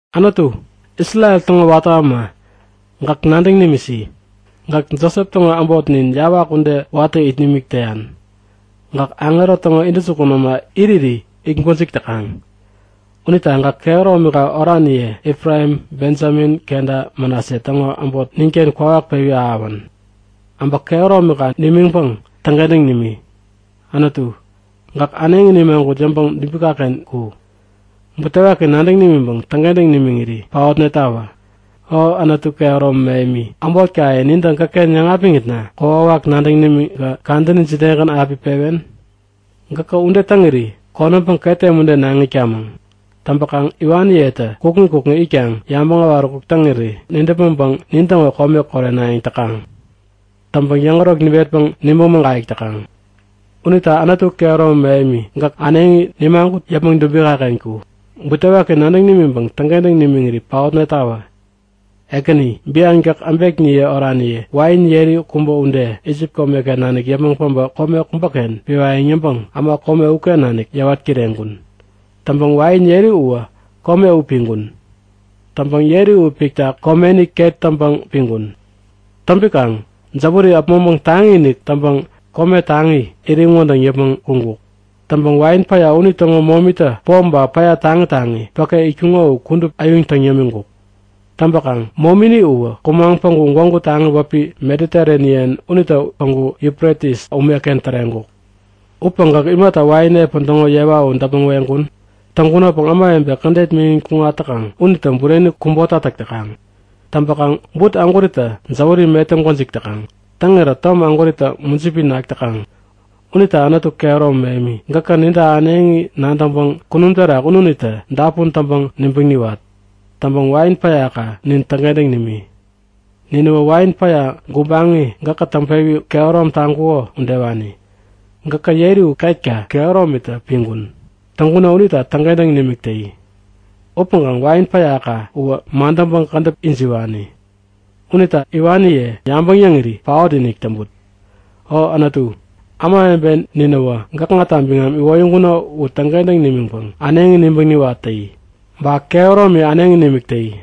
Anutu, Isrel täŋo watä äma, gäk nadäŋ nimisi! Gäk Josep täŋo äbot nin, yawak ude watä it nimik täyan. Gäk aŋero täŋo intäjukun äma iriri it gwäjik täkaŋ. Unita gäk kehäromika oraniye Efraim, Bejamin kenta Manase täŋo äbot ninken kwawak pewi ahäwän! Äbä kehäromika nimiŋpäŋ täŋkentäŋ nimi! Anutu, gäk äneŋi nimagut yäpmäŋ dubikaken ku. Butewaki nadäŋ nimiŋpäŋ täŋkentäŋ nimiŋiri paotnetawä! O Anutu kehäromi mähemi, äbotkaye nintä gäkken yäŋapiŋitna kokwawak nadäŋ nimiŋkä kadäni jidegän api pewen? Gäkä ude täŋiri konämpäŋ ketem ude naŋ itkamäŋ. Täŋpäkaŋ iwaniyetä kukŋi kukŋi itkaŋ yabäŋ äwaräkuk täŋiri nidäpmäŋpäŋ nintäŋo kome korenayäŋ täkaŋ. Täŋpäŋ yäŋärok niwetpäŋ nibäŋ mägayäk täkaŋ. Unita Anutu kehäromi mähemi, gäk äneŋi nimagut yäpmäŋ dubikaken ku. Butewaki nadäŋ nimiŋpäŋ täŋkentäŋ nimiŋiri paotnetawä! Ekäni, bian gäk äbekniye oraniye, wain yeri kubä ude, Isip komeken nanik yäpmäŋ päbä kome kubäken piwayäŋ yäŋpäŋ äma kome uken nanik yäwat kireŋkun. Täŋpäŋ wain yeri uwä kome u piŋkun. Täŋpäŋ yeri u pikta komeni ket täŋpäŋ piŋkun. Täŋpikaŋ jäwäri äpmoŋpäŋ taŋi-inik täŋpäŋ kome taŋi iriŋ wädäŋ yäpmäŋ kuŋkuk. Täŋpäŋ wain päya unitäŋo momitä pom ba päya taŋi taŋi päke itkuŋo u kudup äyuŋ täŋ yämiŋkuk. Täŋpäkaŋ momini uwä kumaŋ päŋku gwägu taŋi wäpi Mediterenian unitä päŋku Yufretis umeken täreŋkuk. Upäŋ gäk imata wain epän täŋo yewa u däpmäŋ weŋkun? Täŋkunopäŋ ämawebe kädet miŋin kuŋat täkaŋ unitä bureni kubota täk täkaŋ. Täŋpäkaŋ but ägwäritä jäwäri metäŋ gwäjik täkaŋ. Täŋirä tom ägwäritä mujipi nak täkaŋ. Unita Anutu kehäromi mähemi, gäkä ninta äneŋi nadäŋpäŋ kunum terak ununitä dapun täŋpäŋ nibäŋ niwat. Täŋpäŋ wain päyaka nin täŋkentäŋ nimi. Ninäwä wain päya gubaŋi gäkä täŋpewi kehärom taŋkuko udewani. Gäkä yeri u ketka kehäromitä piŋkun. Täŋkuno unita täŋkentäŋ nimik täyi. Upäŋkaŋ wain päyaka uwä madäŋpäŋ kädäp ijiwani. Unita iwaniye yabäŋ yäŋiri paot-inik täŋput! O Anutu, ämawebe ninä gäkŋata biŋam iwoyäŋkuno u täŋkentäŋ nimiŋpäŋ äneŋi nibäŋ niwat täyi. Ba kehäromi äneŋi nimik täyi.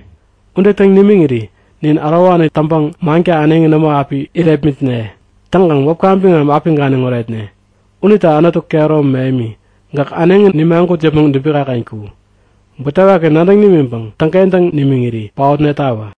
Ude täŋ nimiŋiri nin ärowani täŋpäŋ manka äneŋi nämo api irepmitne. Täŋkaŋ wäpka biŋam api ganiŋ oretne. Unita Anutu kehäromi mähemi, gäk äneŋi nimagut yäpmäŋ dubikaken ku. Butewaki nadäŋ nimiŋpäŋ täŋkentäŋ nimiŋiri paotnetawä!